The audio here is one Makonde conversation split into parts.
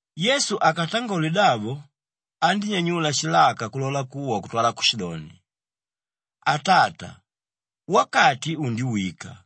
Yesu akatangole davo andínyanyula shilaka kulola kuwa kutwala kushidoni, “Atata, wakati undiwika!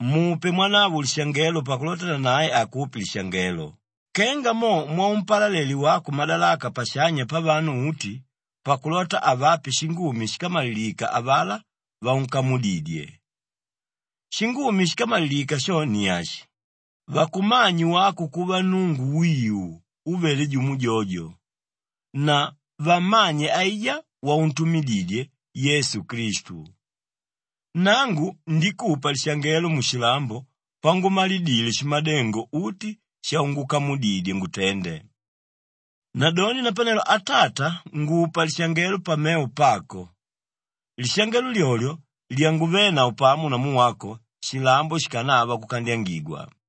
Mupe mwanavo lishangelo pakulota nanae akupe lishangelo kenga mo mwaumpalale wako madalaka pashanya pavanu uti pakulota avape shingumi shíkamalilika avalá vaunkamudidye. Shingumi shíkamalilika sho ni ashi, vakumanye wako kuva Nnungu wiu úvele jumo jojo na vammanye aijá wauntumididye, Yesu Klistu. Nangu ndikupa lishangelo mushilambo pangumalidile shimadengo uti shaungukamudidye ngutende. Nadoni napanelo Atata ngupa lishangelo pamevo pako, lishangelo lyolyo lyanguvénavo pamo namu wako shilambo shikanava kukandyangigwa.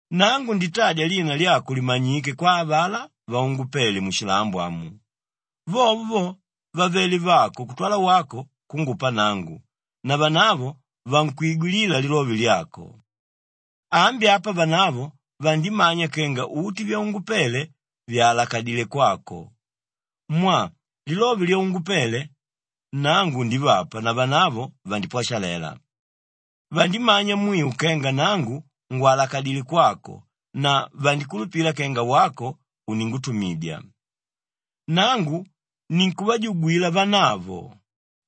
“Nangu nditadya lina lyako limanyike kwa avalá vaungupele mushilambo amu. Vovo vo, vavelé vako kutwala wako kungupa nangu na vanavo vankwigwilila lilove lyako. Ambi apa vanavo vandimanya kenga uti vyaungupele vyàlakadile kwako mwaa lilove lyaungupele, nangu ndivapa na vanavo vandipwashalela; vandimanya mwiu kenga nangu ngwalakadilé kwako na vandikulupila kenga wako uningutumidya. “Nangu ninkuvajugwila vanavo;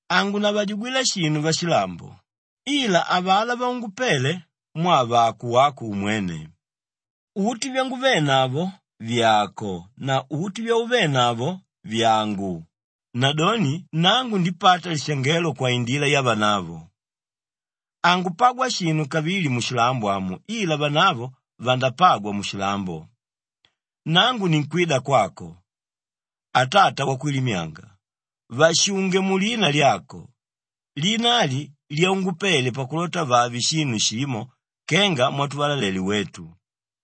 hangunavajugwila shinu vashilambo, ila avalá vaungupele mwaa vàko wako umwene. Uti vyanguvenavo vyàko na uti vyauvenavo vyàngu, nadoni nangu ndipata lishangelo kwaindila yavanavo. Hangupagwa shinu kavili mushilambo amu ila vanavo vandapagwa mushilambo; nangu ninkwida kwako. Atata Wakwilimyanga, vashunge mulina lyako, lina ali lyaungupele pakulota vave shinu shimo kenga mwatuvalalele wetu.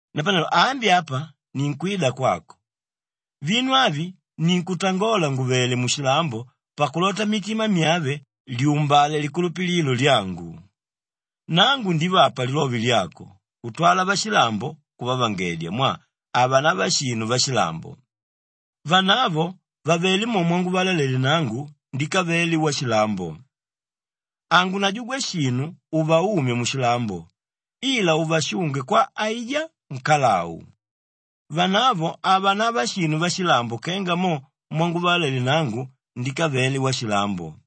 “Napanelo ambi apa ninkwida kwako; vinu avi ninkutangola ngùvele mushilambo pakulota mmitima myave lyumbale likulupililo lyangu. Nangu ndivapa lilove lyako kutwala vashilambo kuvavangedya mwaa havanava shinu vashilambo; vanavo vavelé mo mwanguvalalele nangu ndikave washilambo. Hangunajugwa shinu uvaumye mushilambo ila uvashunge kwa aijá nkalau. Vanavo havanava shinu vashilambo kenga mo mwanguvalalele nangu ndikave washilambo.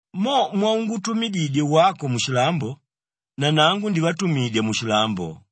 Mo mwaungutumididye wako mushilambo, nanangu ndivatumidya mushilambo.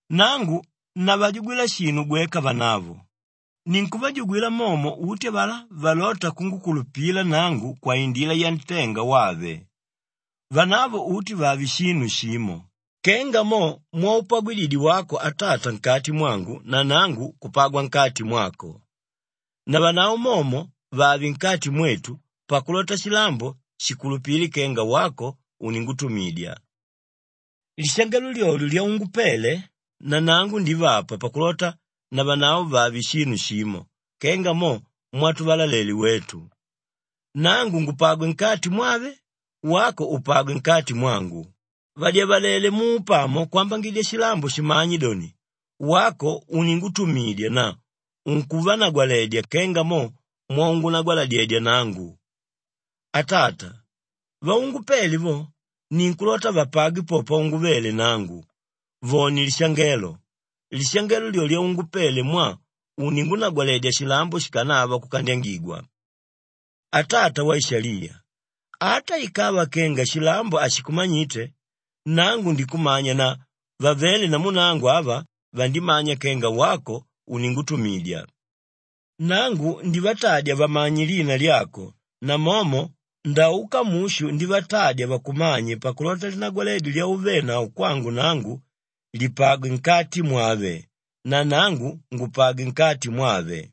“Nangu navajugwila shinu gweka vanavo; ninkuvajugwila momo uti avalá valóta kungukulupila nangu kwaindila yantenga wave. Vanavo uti vave shinu shimo kenga mo mwaupagwididye wako Atata nkati mwangu na nangu kupagwa nkati mwako. Navanavo momo vave nkati mwetu pakulota shilambo shikulupile kenga wako uningutumidya. Lishangelo lyolyo lyaungupele, nanangu ndivapa pakulota navanavo vave shinu shimo kenga mo mwatuvalalele wetu; nangu ngupagwe nkati mwave, wako upagwe nkati mwangu; vadyavalele muupamo kwambangidya shilambo shimanye doni, wako uningutumidya na unkuvanagwaledya kenga mo mwaungunagwaladyedya nangu. “Atata, vaungupele vo, ninkulota vapagwe po panguvele nangu vone lishangelo; lishangelo lyo lyaungupele mwaa uningunagwaledya shilambo shikanava kukandyangigwa. Atata Waishaliya, ata ikava kenga shilambo hashikumanyite, nangu ndikumanya na vavéle namu nangu ava, vandimanya kenga wako uningutumidya. Nangu ndivatadya vamanye lina lyako namomo ndauka mushu ndivatadya vakumanye pakulota linagwaledyo lyauvenavo kwangu nangu lipagwe nkati mwave na nangu ngupagwe nkati mwave.”